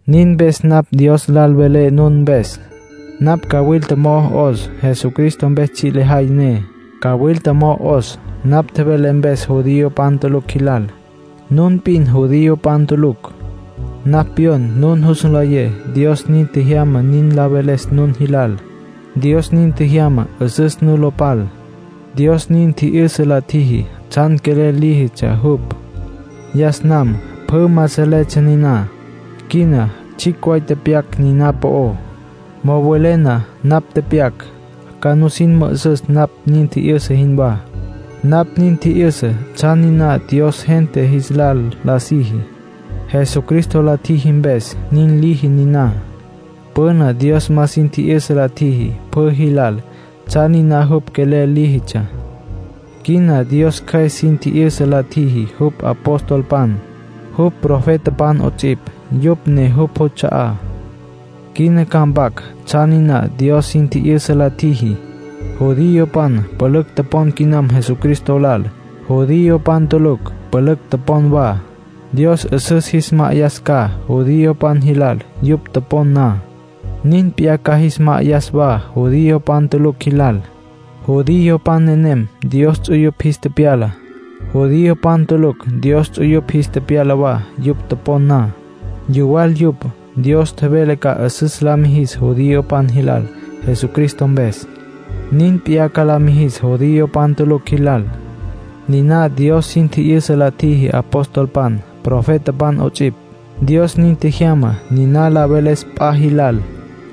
Nin mpes napj Dios lal velé nun mpes. Napj cawilta mo'o 'os, Jesucristo mpes tsji' lejay ne. Cawilta mo'o 'os, napj tjevelé mpes judiopan tulucj jilal. Nun p'in judiopan tulucj. Napj pyon nun jus nlayé Dios nin tjejyama nin la veles nun jilal. Dios nin tjejyama 'üsüs nu lo pal. Dios nin tji'yüsa la tjiji tsjan quelel líjitsja jupj. Yas nam pjü ma salejeptsja niná. Quina tsjicj way tepyac niná po'ó. Mo'o welé na napj tepyac, ca nusin mü'üsüs napj nin tji'yüsa jinwá. Napj nin tji'yüsa tsjan niná Dios gente jis lal la siji. Jesucristo la tjiji mpes, nin liji niná. Püna Dios ma sin tji'yüsa la tjiji pjü jilal tsjan niná jupj quelel líjitsja. Quina Dios Cjües sin tji'yüsa la tjiji jupj apostolpan, jupj profetapan 'ots'ipj. Yupj ne jupj juts'a'á. Quina ca mpac tsjan niná Dios sin tji'yüsa la tjiji. Judiopan pülücj topon quinam Jesucristo lal. Judiopan tulucj pülücj topon wa. Dios 'üsüs jis ma'ayas ca judiopan jilal yupj topon na. Nin p'iyá ca jis ma'ayas wa judiopan tulucj jilal. Judiopan nenem Dios ts'uyupj jis tepyala. Judiopan tulucj Dios ts'uyupj jis tepyala wa yupj topon na. Yuwal yupj. Dios tjevele ca 'üsüs la mijis judiopan jilal Jesucristo mpes. Nin p'iyá ca la mijis judiopan tulucj jilal. Niná Dios sin tji'yüsa la tjiji apostolpan, profetapan 'ots'ipj. Dios nin tjejyama niná la veles p'a jilal.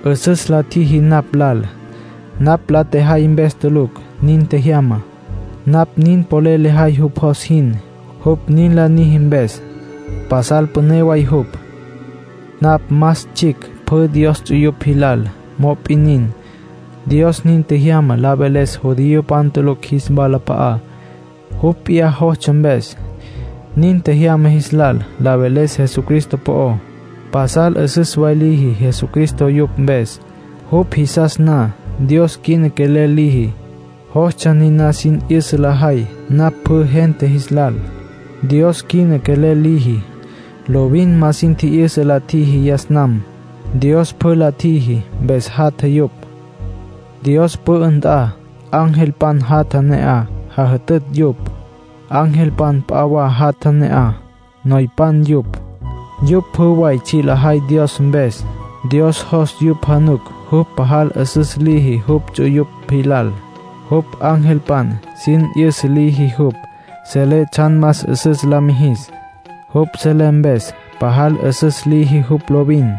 'Üsüs la tjiji napj lal. Napj la tjejay mpes tulucj nin tjejyama. Napj nin polel lejay jupj jos jin, jupj nin la niji mpes. Pasal püné way jupj. Napj más tsjicj pjü Dios ts'uyupj jilal; mop'in nin, Dios nin tjejyama la veles judiopan tulucj jis walap'a'á, jupj p'iyá jostsja mpes. Nin tjejyama jis lal la veles Jesucristo po'ó. Pasal 'üsüs way liji Jesucristo yupj mpes, jupj jisas na. Dios quina quelel liji, jostsja niná sin 'yüsa lejay napj pjü gente jis lal. Dios quina quelel liji, lovin ma sin tji'yüsa la tjiji yas nam. Dios pjü la tjiji, mpes jatja yupj. Dios pü'ü nt'a, angelpan jatja ne'aj, jajütütj yupj. Angelpan p'a wa jatja ne'aj, noypan yupj. Yupj pjü way tsji' lajay Dios mpes. Dios jos yupj januc jupj pajal 'üsüs liji jupj ts'uyupj jilal. Jupj angelpan sin 'yüsa liji jupj selé tsjan más 'üsüs la mijis. Jupj selé mpes pajal 'üsüs liji jupj lovin.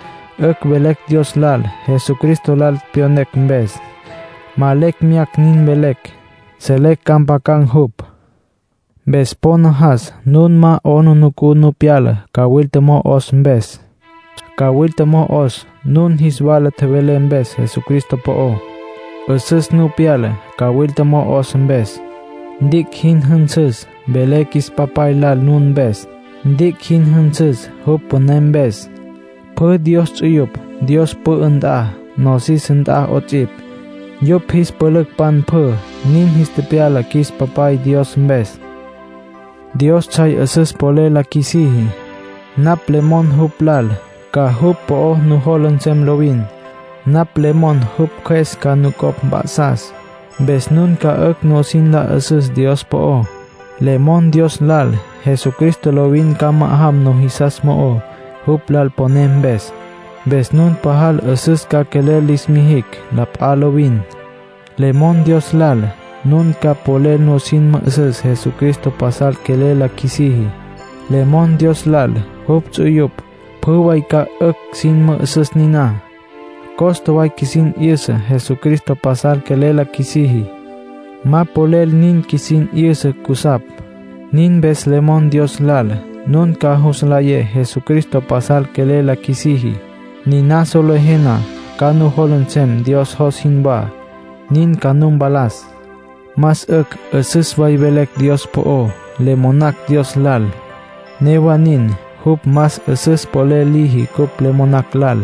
'Ücj velecj Dios lal, Jesucristo lal pyonecj mpes. Ma lecj meyacj nin velecj. Selecj ca mpjacam jupj. Mpes po najas nun ma 'aplijila nu pyala, cawilta mo'o 'os mpes. Cawilta mo'o 'os, nun jis wala tjevelé mpes Jesucristo po'ó. 'Üsüs nu pyala, cawilta mo'o 'os mpes. Ntic' jin jünsüs, velé qjuis Papay lal nun mpes. Ntic' jin jünsüs, jupj püné mpes. Pjü Dios ts'uyupj Dios pü'ü nt'a, nosis nt'a 'ots'ipj, yupj jis pülücpan pjü. Nin jis tepyala qjuis Papay Dios mpes. Dios tsjay 'üsüs polel la qjuisiji. Napj le mon jupj lal, ca jupj po'o nujola nsem lovin. Napj le mon jupj Cjües ca nucopj mp'a'sas, mpes nun ca 'ücj nusin la 'üsüs Dios po'ó. Le mon Dios lal, Jesucristo lovin ca ma'ajam nujisas mo'ó, jupj lal poné mpes. Mpes nun pajal 'üsüs ca quelel lis mijicj la p'a lovin. Le mon Dios lal, nun ca polel nusin mü'üsüs Jesucristo pasal quelel la qjuisiji. Le mon Dios lal jupj ts'uyupj pjü way ca 'ücj sin mü'üsüs niná. Costa way qjuisin 'yüsa Jesucristo pasal quelel la qjuisiji. Ma polel nin qjuisin 'yüsa cusapj. Nin mpes le mon Dios lal nun ca jus nlayé Jesucristo pasal quelel la qjuisiji. Niná solejé na, ca nujola nsem Dios jos jinwá, nin ca nu mpalas. Más 'ücj 'üsüs way velecj Dios po'ó. Le monacj Dios lal; newa nin, jupj más 'üsüs polel liji cupj le monacj lal.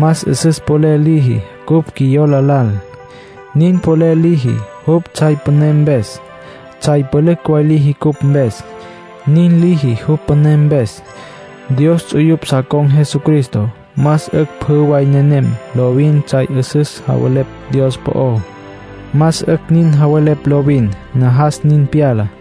Más 'üsüs polel liji cupj qjuiyola lal. Nin polel liji, jupj tsjay püné mpes. Tsjay pülücj way liji cupj mpes. Nin liji, jupj püné mpes. Dios ts'uyupj sa con̈ Jesucristo; más 'ücj pjü way nenem lovin tsjay 'üsüs javelepj Dios po'ó. Más 'ücj nin javelepj lovin. Najas nin pyala.